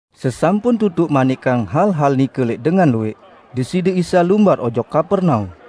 Sesampun tutuq manikang hal-hal nike lẽq dengan luwẽq, Deside Isa lumbar ojok Kapernaum.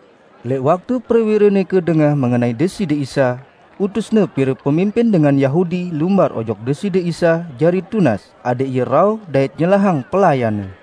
Lẽq waktu prewire nike dengah mengenai Deside Isa, utusne pire pemimpin dengan Yahudi lumbar ojok Deside Isa jari tunas adẽq Ie rauh dait nyelahang pelayanne.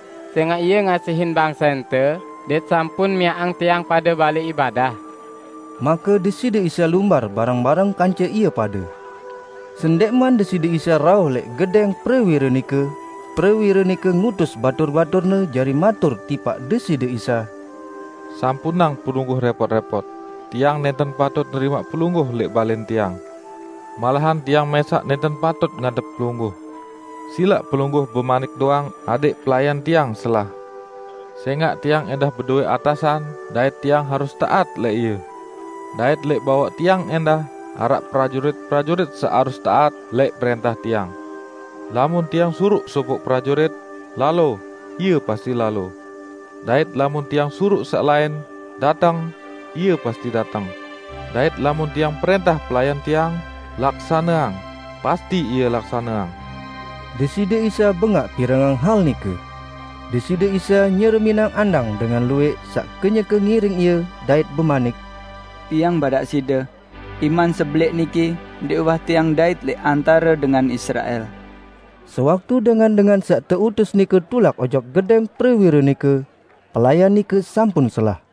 sẽngaq ie ngasihin bangsente dait sampun miaqang tiang pade balẽ ibadah." Make Deside Isa lumbar bareng-bareng kance ie pade. Sendẽqman Deside Isa rauh lẽq gedẽng prewire nike, prewire nike ngutus batur-baturne jari matur tipaq Deside Isa, "Sampunang Pelungguh rẽpot-rẽpot, tiang nẽnten patut nerimaq Pelungguh lẽq balẽn tiang. Malahan tiang mẽsaq nẽnten patut ngadep Pelungguh. Silaq Pelungguh bemanik doang adẽq pelayan tiang selah. Sẽngaq tiang ẽndah bedowẽ atasan dait tiang harus taat lẽq ie. Dait lẽq bawaq tiang ẽndah araq prajurit-prajurit saq harus taat lẽq prẽntah tiang. Lamun tiang suruq sopoq prajurit, 'Lalo!' ie pasti lalo. Dait lamun tiang suruq saq lain, 'Dateng!' ie pasti dateng; dait lamun tiang prẽntah pelayan tiang, 'Laksaneang!' pasti ie laksaneang." Deside Isa bengaq pirengang hal nike. Deside Isa nyereminang andang dengan luwẽq saq kenyeke ngiring Ie dait bemanik, "Tiang badaq side, iman sebelẽq niki ndẽq uwah Tiang ndait lẽq antare dengan Israel." Sewaktu dengan-dengan saq teutus nike tulak ojok gedẽng prewire nike, pelayan nike sampun selah.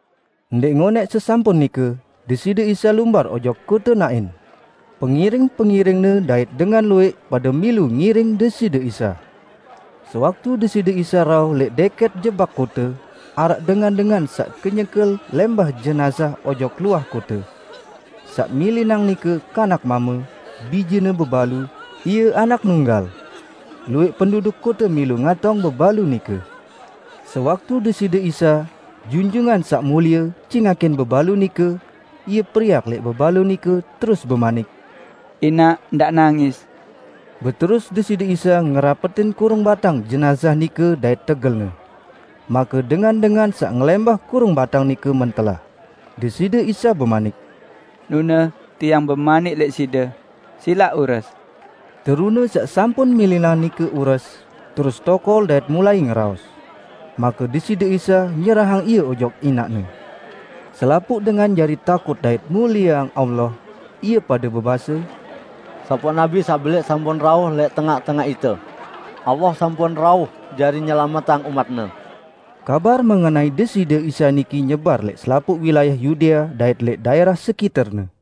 Ndẽq ngonẽq sesampun nike, Deside Isa lumbar ojok kote Nain. Pengiring-pengiring-Ne dait dengan luwẽq pade milu ngiring Deside Isa. Sewaktu Deside Isa rauh lẽq dẽkẽt jebak kote, araq dengan-dengan saq kenyeke lẽmbah jenazah ojok luah kote. Saq milinang nike kanak mame, bijene bebalu, ie anak nunggal. Luwẽq penduduk kote milu ngatong bebalu nike. Sewaktu Deside Isa, Junjungan Saq Mulie cingakin bebalu nike, Ie periak lẽq bebalu nike terus bemanik, "Inaq, ndaq nangis!" Beterus Deside Isa ngerapetin kurung batang jenazah nike dait tegelne. Make dengan-dengan saq ngelẽmbah kurung batang nike mentelah. Deside Isa bemanik, "Nune, Tiang bemanik lẽq side, silaq ures!" Terune saq sampun milinang nike ures, terus tokol dait mulai ngeraos. Make Deside Isa nyerahang ie ojok inaqne. Selapuq dengan jari takut dait mulieang Allah. Ie pade bebase, "Sopoq nabi saq belẽq sampun rauh lẽq tengaq-tengaq ite! Allah sampun rauh jari nyelametang umat-Ne!" Kabar mengenai Deside Isa niki nyebar lẽq selapuq wilayah Yudea dait lẽq daẽrah sekiterne.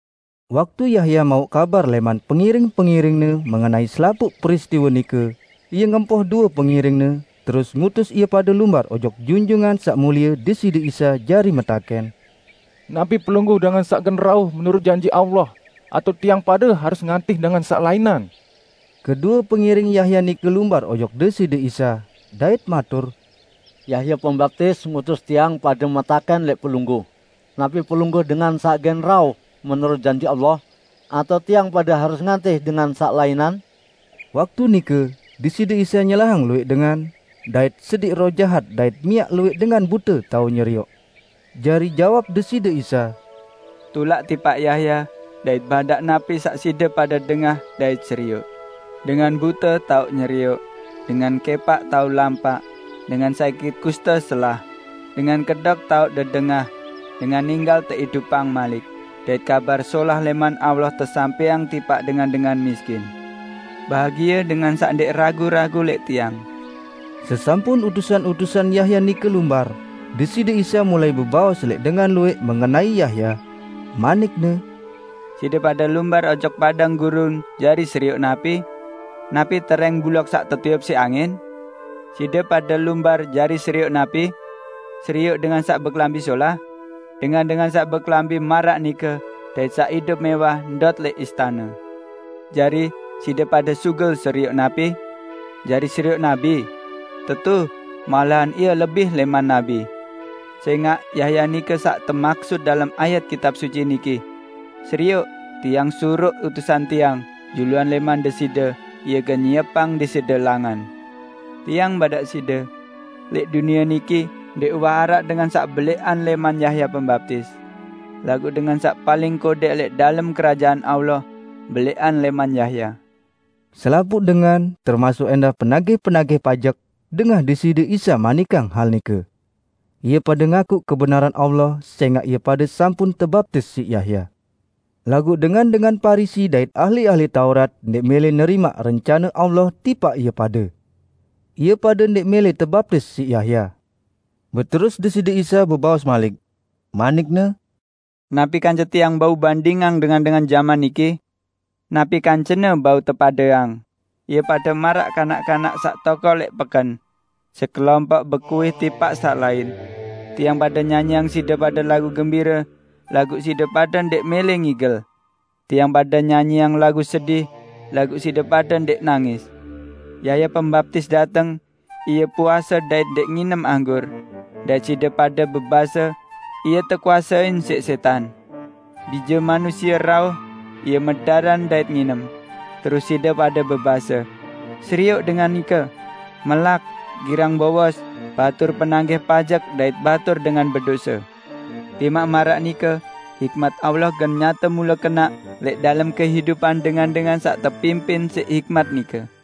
Waktu Yahya mauq kabar lẽman pengiring-pengiringne mengenai selapuq peristiwe nike, ie ngempoh due pengiringne terus ngutus ie pade lumbar ojok Junjungan Saq Mulie Deside Isa jari metakẽn, "Napi Pelungguh dengan saq gen rauh menurut janji Allah, atao tiang pade harus ngantih dengan saq lainan?" Kedue pengiring Yahya nike lumbar ojok Deside Isa, dait matur, "Yahya Pembaptis ngutus tiang pade metakẽn lẽq Pelungguh, napi Pelungguh dengan saq gen rauh menurut janji Allah, atao tiang pade harus ngantih dengan saq lainan?" Waktu nike, Deside Isa nyelahang luwẽq dengan, dait sediq roh jahat dait miaq luwẽq dengan bute tao nyerioq. Jari jawab Deside Isa, "Tulak tipaq Yahya dait badaq napi saq side pade dengah dait serioq: dengan bute tao nyerioq, dengan kẽpaq tao lampaq, dengan sakit kuste selah, dengan kedok tao dedengah, dengan ninggal teidupang malik, dait Kabar Solah lẽman Allah tesampẽang tipaq dengan-dengan miskin. Bahagie dengan saq ndẽq ragu-ragu lẽq Tiang." Sesampun utusan-utusan Yahya nike lumbar, Deside Isa mulai bebaos lẽq dengan luwẽq mengenai Yahya, manik-Ne, "Side pade lumbar ojok padang gurun jari serioq napi? Napi terẽng buloq saq tetiup siq angin? Side pade lumbar jari serioq napi? Serioq dengan saq bekelambi solah? Dengan-dengan saq bekelambi maraq nike dait saq idup mẽwah ndot lẽq istane! Jari, side pade sugul serioq napi? Jari serioq nabi? Tetu, malahan ie lebih lẽman nabi. Sẽngaq Yahya nike saq temaksut dalem ayat Kitab Suci niki, 'Serioq, Tiang suruq utusan Tiang, juluan lẽman Deside, ie gen nyiepang Deside langan.' Tiang badaq side: Lẽq dunie niki ndẽq uwah araq dengan saq belẽqan lẽman Yahya Pembaptis. Laguq dengan saq paling kodẽq lẽq dalem Kerajaan Allah, belẽqan lẽman Yahya." Selapuq dengan -- termasuk ẽndah penagih-penagih pajek -- dengah Deside Isa manikang hal nike. Ie pade ngakuq kebenaran Allah sẽngaq ie pade sampun tebaptis siq Yahya. Laguq dengan-dengan Parisi dait ahli-ahli Taurat ndẽq mẽlẽ nerimaq rencane Allah tipaq ie pade. Ie pade ndẽq mẽlẽ tebaptis siq Yahya. Beterus Deside Isa bebaos malik, manik-Ne, "Napi kance Tiang bandingang dengan-dengan jaman niki? Napi kancene bau tepadeang? Ie pade maraq kanak-kanak saq tokol lẽq peken; sekelompoq bekuih tipaq saq lain, 'Tiang pade nyanyiang side pade lagu gembire, laguq side pade ndẽq mẽlẽ ngigel! Tiang pade nyanyiang lagu sedih, laguq side pade ndẽq nangis!' Yahya Pembaptis dateng -- ie puase dait ndẽq nginem anggur -- dait side pade bebase, 'Ie tekuasein siq sẽtan!' Bije Manusie rauh -- Ie medaran dait nginem -- terus side pade bebase, 'Serioq dengan nike! Melak, girang bowos, batur penagih pajek, dait batur dengan bedose!' Timaq maraq nike, hikmat Allah gen nyate mule kenaq lẽq dalem kehidupan dengan-dengan saq tepimpin siq hikmat nike."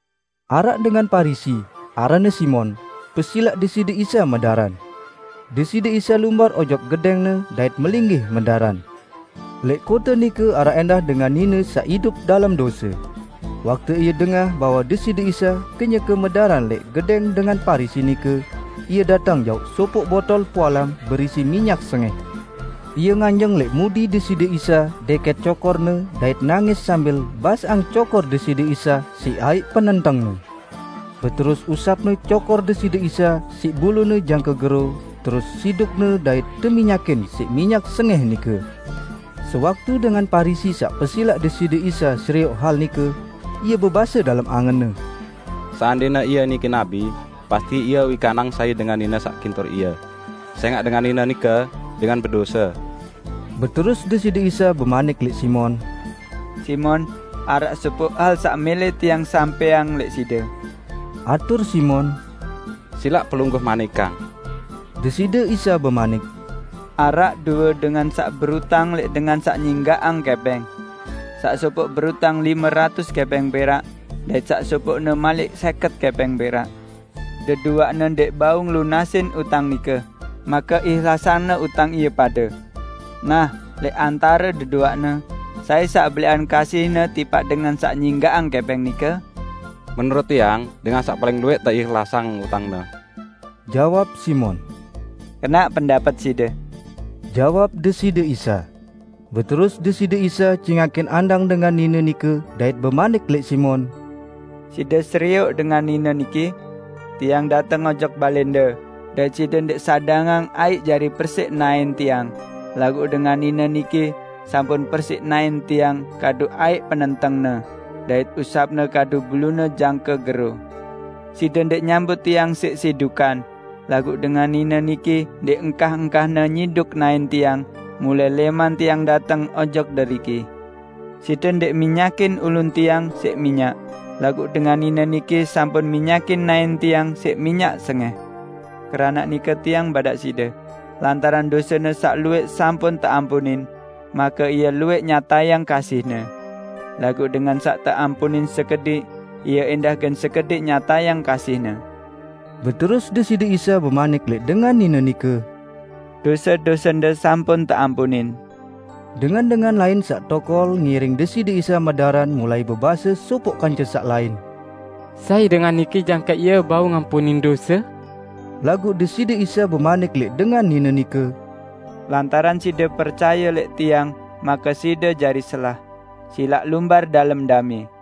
Araq dengan Parisi, aranne Simon, pesilaq Deside Isa medaran. Deside Isa lumbar ojok gedẽngne dait melinggih medaran. Lẽq kote nike araq ẽndah dengan nine saq idup dalem dose. Waktu ie dengah bahwe Deside Isa kenyeke medaran lẽq gedẽng dengan Parisi nike, ie dateng jauq sopoq botol pualam berisi minyak sengẽh. Ie nganjeng lẽq mudi Deside Isa dẽkẽt cokor-Ne dait nangis sambil basaqang cokor Deside Isa siq aiq penentengne. Beterus usapne cokor Deside Isa siq bulune jangke gero terus sidukne dait teminyakin siq minyak sengẽh nike. Sewaktu dengan Parisi saq pesilaq Deside Isa serioq hal nike, ie bebase dalem angenne, "Seandẽne Ie niki nabi, pasti Ie wikanang sai dengan nine saq kintur Ie, sẽngaq dengan nine nike dengan bedose!" Beterus Deside Isa bemanik lẽq Simon, "Simon, araq sopoq hal saq mẽlẽ Tiang sampẽang lẽq side." Atur Simon, "Silaq Pelungguh manikang." Deside Isa bemanik, "Araq due dengan saq berutang lẽq dengan saq nyinggaqang kẽpẽng. Saq sopoq berutang lime ratus kẽpẽng perak, dait saq sopoqne malik sẽket kẽpẽng perak. Deduaqne ndẽq bau ngelunasin utang nike, make ihlasangne utang ie pade. Nah, lẽq antare deduaqne sai saq belẽqan kasihne tipaq dengan saq nyinggaqang kẽpẽng nike?" "Menurut tiang dengan saq paling luwẽq teihlasang utangne!" jawab Simon. "Kenaq pendapet side," jawab Deside Isa. Beterus Deside Isa cingakin andang dengan nine nike dait bemanik lẽq Simon, "Side serioq dengan nine niki? Tiang dateng ojok balẽnde, dait side ndẽq sadangang aiq jari persiq naẽn Tiang; laguq dengan nine niki sampun persiq naẽn Tiang kadu aiq penentengne, dait usapne kadu bulune jangke gero. Side ndẽq nyambut Tiang siq sidukan, laguq dengan nine niki ndẽq engkah-engkahne nyiduk naẽn Tiang mulai lẽman Tiang dateng ojok deriki. Side ndẽq minyakin ulun Tiang siq minyak, laguq dengan nine niki sampun minyakin naẽn Tiang siq minyak sengẽh. Keranaq nike Tiang badaq side: Lantaran dosene saq luwẽq sampun teampunin, make ie luwẽq nyatayang kasihne. Laguq dengan saq teampunin sekediq, ie ẽndah gen sekediq nyatayang kasihne." Beterus Deside Isa bemanik lẽq dengan nine nike, "Dose-dosende sampun teampunin." Dengan-dengan lain saq tokol ngiring Deside Isa medaran mulai bebase sopoq kance saq lain, "Sai dengan niki jangke Ie bau ngampunin dose?" Laguq Deside Isa bemanik lẽq dengan nine nike, "Lantaran side percaye lẽq Tiang make side jari selah, silaq lumbar dalem damẽ!"